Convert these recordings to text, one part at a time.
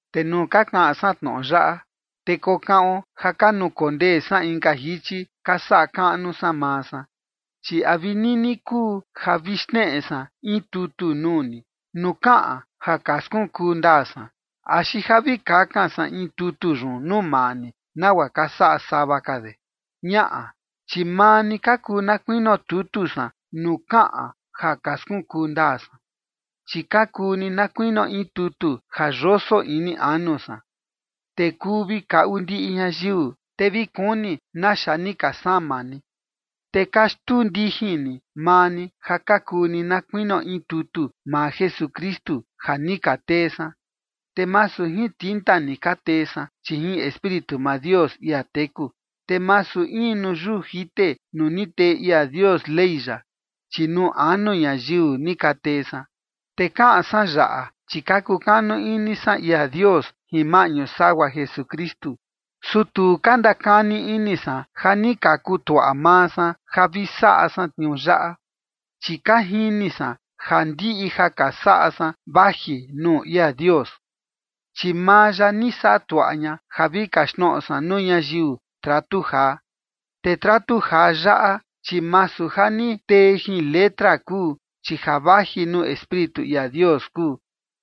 Te nuu ka kaꞌan san tnoꞌo yaꞌa, te kokaꞌon ja ka nukondee san inka jichi ka saꞌa kaꞌnu san maa san, chi ¿a vi nini kuu ja vi xneꞌe san in tutu nuu ni nuu kaꞌan ja ka skunkuu ndaa san, axi ja vi kakan san in tutu yun nuu maa ni nagua ka saꞌa sava de? Ñaꞌa, chi maa ni ka kuu na kuinio tutu san nuu kaꞌan ja ka skunkuu ndaa san, chi ka kuu ni na kuinio in tutu ja yoso ini anu san, te kuu vi kaꞌu ndiꞌi ñayiu, te vi kuni naxa ni ka sama ni. Te ka xtuu ndijin ni maa ni ja ka kuu ni na kuinio in tutu maa Jesukristu, ja ni ka tee san. Te masu jin tinta ni ka tee san, chi jin Espíritu maa Dios, ia teku. Te masu in nuu yuu jite nuu ni tee ia Dios Ley ya, chi nuu anu ñayiu ni ka tee san. Te kaꞌan san yaꞌa, chi ka kukanu ini san ia Dios jin maꞌñu sagua Jesukristu. Su tu ka ndakani ini san ja ni ka kutuaꞌa maa san ja vi saꞌa san tniuu yaꞌa. Chi ka jini san ja ndiꞌi ja ka saꞌa san vaji nuu ia Dios. Chi maa ya ni saꞌa tuaꞌa ña ja vi kaxtnoꞌo san nuu ñayiu tratu jaa. Te tratu jaa yaꞌa, chi masu ja ni tee jin letra kuu, chi ja vaji nuu Espíritu ia Dios kuu,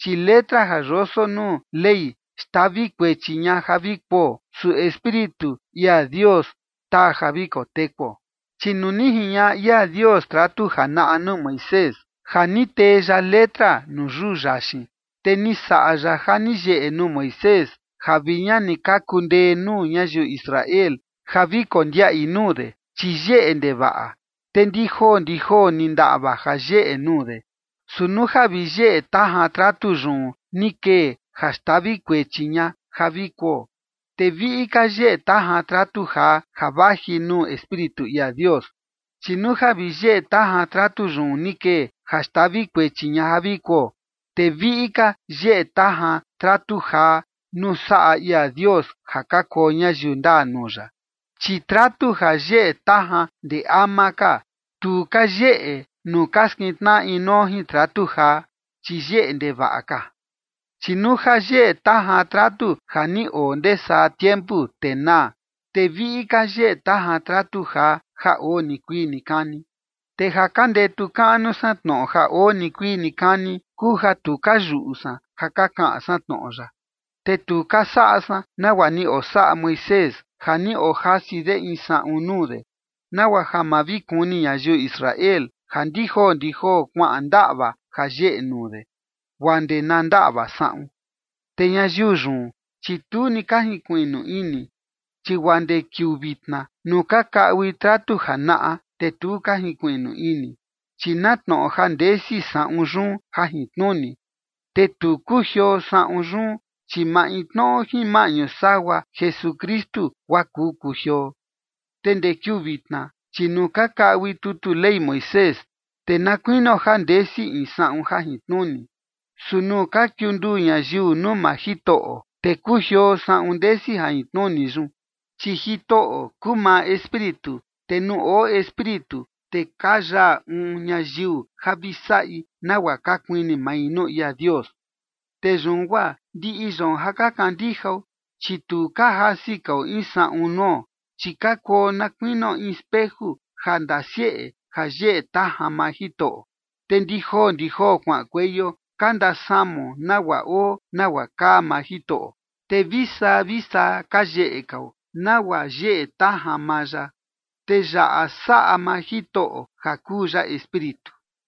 chi letra ja yoso nuu Ley xtavi kuechi ña ja vi kuo, su Espíritu ia Dios taa ja vi kotekuo. Chi nuu ni jiñaꞌa ia Dios tratu janaꞌa nuu Moisés, ja ni tee ya letra nuu yuu yaxin, te ni saꞌa ya ja ni yeꞌe nuu Moisés ja vi ña ni ka kundee nuu ñayiu Israel ja vi kondiaꞌi nuu de, chi yeꞌe ndevaꞌa, te ndi joo ndi joo, te ni ndaꞌva ja yeꞌe nuu de. Su nuu ja vi yeꞌe tajan tratu yun ni kee ja xtavi kuechi ña ja vi kuo, te viꞌi ka yeꞌe tajan tratu jaa ja vaji nuu Espíritu ia Dios. Chi nuu ja vi yeꞌe tajan tratu yun ni kee ja xtavi kuechi ña ja vi kuo, te viꞌi ka yeꞌe tajan tratu jaa nuu saꞌa ia Dios ja ka kuo ñayiu ndaa nuu ya. Chi tratu ja yeꞌe tajan ndee ama ka, tu ka yeꞌe nuu ka skintnaꞌa inuo jin tratu jaa, chi yeꞌe ndevaꞌa ka. Chi nuu ja yeꞌe tajan tratu ja ni oo ndee saa tiempu, te naa, te viꞌi ka yeꞌe tajan tratu jaa ja oo nikuii nikani. Te ja ka ndetu kaꞌnu san tnoꞌo ja oo nikuii nikani kuu ja tu ka yuꞌu san ja ka kaꞌan san tnoꞌo ya. Te tu ka saꞌa san nagua ni osaꞌa Moisés ja ni ojasi de in saꞌun nuu de, nagua ja ma vi kuni ñayiu Israel ja ndi joo ndi joo kuaꞌan ndaꞌva ja yeꞌe nuu de, guaa ndee na ndaꞌva saꞌun. Te ñayiu yun, chi tu ni ka jinkuiꞌnu ini, chi guaa ndee kiuu vitna nuu ka kaꞌui tratu janaꞌa, te tu ka jinkuiꞌnu ini, chi na tnoꞌo ja ndesi saꞌun yun jajintnuni, te tu kujioo saꞌun yun, chi maintnoꞌo jin maꞌñu sagua Jesukristu guaa kuu kujioo. Te ndee kiuu vitna, chi nuu ka kaꞌui tutu Ley Moisés, te na kuinio ja ndesi in saꞌun jajintnuni. Su nuu ka kiunduu ñayiu nuu maa Jitoꞌo, te kujioo saꞌun ndesi jajintnuni yun. Chi Jitoꞌo kuu maa Espíritu, te nuu oo Espíritu, te ka yaa uun ñayiu ja vi saꞌi nagua ka kuini mai nuu ia Dios. Te yun guaa ndiꞌi yoon ja ka kandijao, chi tu ka jasi kao in saꞌun nuo, chi ka kuo na kuinio in speju ja ndasieꞌe ja yeꞌe tajan maa Jitoꞌo, te ndi joo ndi joo kuaꞌankueio ka ndasamao nagua oo nagua kaa maa Jitoꞌo, te vi saa vi saa ka yeꞌe kao, nagua yeꞌe tajan maa ya. Te yaꞌa saꞌa maa Jitoꞌo ja kuu ya Espíritu.